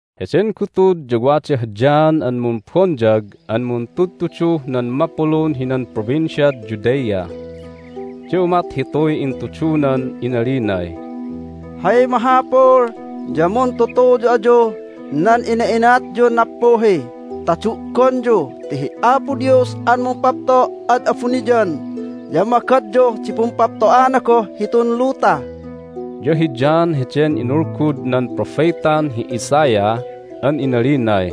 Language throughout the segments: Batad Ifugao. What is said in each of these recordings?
Heden gutud ya wadah John an Mumbonyag an muntudtuduh nan mapulun hinan Provinciad Judea, ya umat hituy intudunan inalinay, "Hay mahapul ya muntutuyu ayuh nan ina'inatyun nappuhi ta du'gonyu ti hi Apo Dios an mumpapto' ad abuniyan ya magadyuh di pumpapto'ana goh hitun luta!" Ya hi John heden inulgud nan propetan hi Isaiah an inalinay,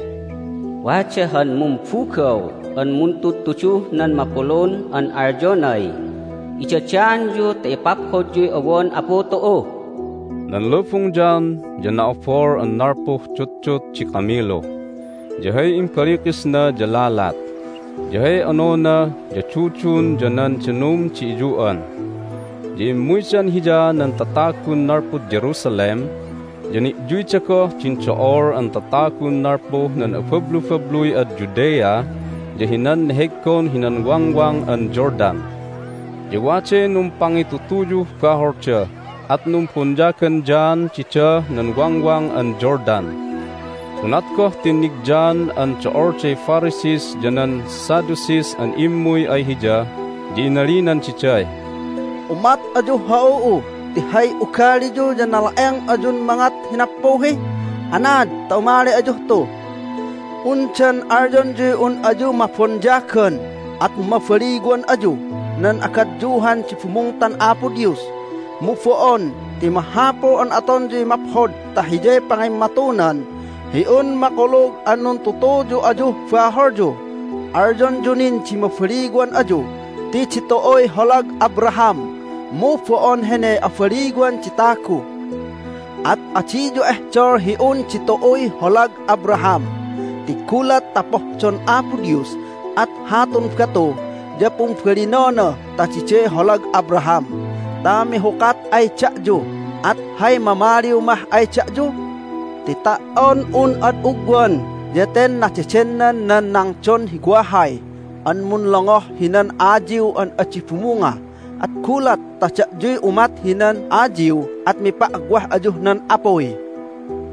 "Wada han mumbugaw an muntudtuduh nan mapulun an alyonay, Idadaanyu ta ipaphodyuy owon Apu tu'u!" Nan lubung John ya na"abol an nalpuh dutdut di kamilu, ya hay imbalikisna ya lalat, ya hay onona ya dudun ya nan danum di iyu'an. Ya immuydan hiya nan tatagun nalpud Jerusalem, ya ni'yuyda goh din do'ol an tatagun nalpuh nan abablubabluy ad Judea ya hinan neheggon hinan Wangwang an Jordan. Ya waday numpangitutuyuh baholda, at numbonyagan John didah nan Wangwang an Jordan. Unat goh tinnig John an do'olday Pharisees ya nan Sadducees an immuy ay hiya ya inalinan diday, "Umat ayuh ha'u'u ti hay ugaliyu ya nala'eng ayun mangat hi nappuhi! Anaad ta umali ayuh tu? Undan alyonyuy un ayu mabonyagan at mabaliwan ayuh nan agadyuhan di bumungtan Apo Dios? Mu bo'on, ti mahapul an atonyuy maphod ta hiyay pangimmatunan hi un makulug an nuntutuyu ayuh baholyu! Alyonyu nin di mabaliwan ayu ti ditu'uy holag Abraham, mu bo'on hene abaliwan di tagu! At adiyu ehdol hi un ditu'uy holag Abraham, ti gulat ta pohdon Apo Dios at hatun batu ya pumbalinona ta diday holag Abraham ta mihukat ay da'yu, at hay mamaliw mah ay da'yu? Ti ta"on un ad ugwan ya ten nadedennan nan nangdon hi wahay an munlongoh hinan ayiw an adi bumunga, at gulat ta da'yuy umat hinan ayiw at mipa'wah ayuh nan apuy!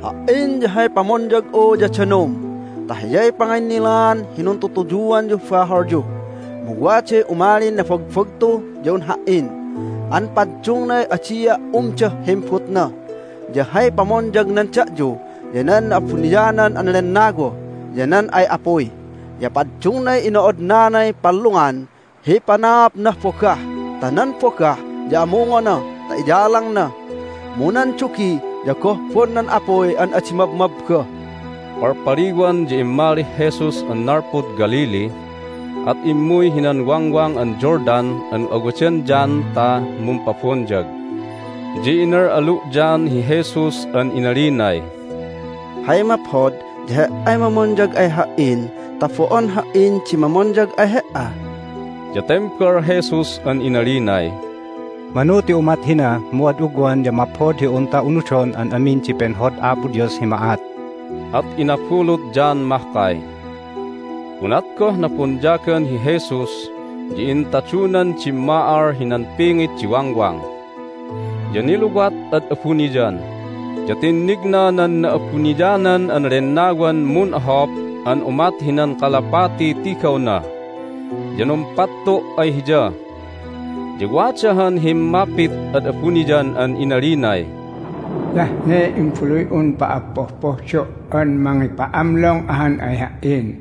Ha"in ya hay pamonyag'u ya danum ta hiyay panginnilaan hi nuntutuyuanyuh baholyu. Mu waday umalin nabagbagtu ya un ha"in an paddungnay adia' umdah himbutna, ya hay pamonyagnan da'yu ya nan Na'abuniyanan an Lennawa ya nan ay apuy. Ya paddungnay ino'odnanay pallungan hi panaapnah bogah ta nan bogah ya amungona ta iyalangna, mu nan dugi ya gohbon nan apuy an adi mabmabba!" Palpaliwan ya immalih Jesus an nalpud Galilee, at immuy hinan Wangwang an Jordan an awadan John ta mumpabonyag. Ya inal'alu' John hi Jesus an inalinay, "Hay maphod ya He"ay mamonyag ay ha"in ta bo'on ha"in di mamonyag ay He"a!" Ya tembal Jesus an inalinay, "Manu ti umat hina mu ad ugwan ya maphod hi unta unudon an amin di penhod Apo Dios hi ma'at." At inabulut John mahkay. Unat goh nabonyagan hi Jesus ya intadunan dimma'al hinan pingit di wangwang. Ya niluwat ad abuniyan, ya tinnigna nan Na'abuniyanan an Lennawan mun'ohop an umat hinan kalapatiy tigawna, ya numpattu' ay Hiya. Ya wada han himmapit ad abuniyan an inalinay, "Hiyah ne Imbaluy'un pa'appohpohdo' an mangipa'amlong ahan ay Ha"in!"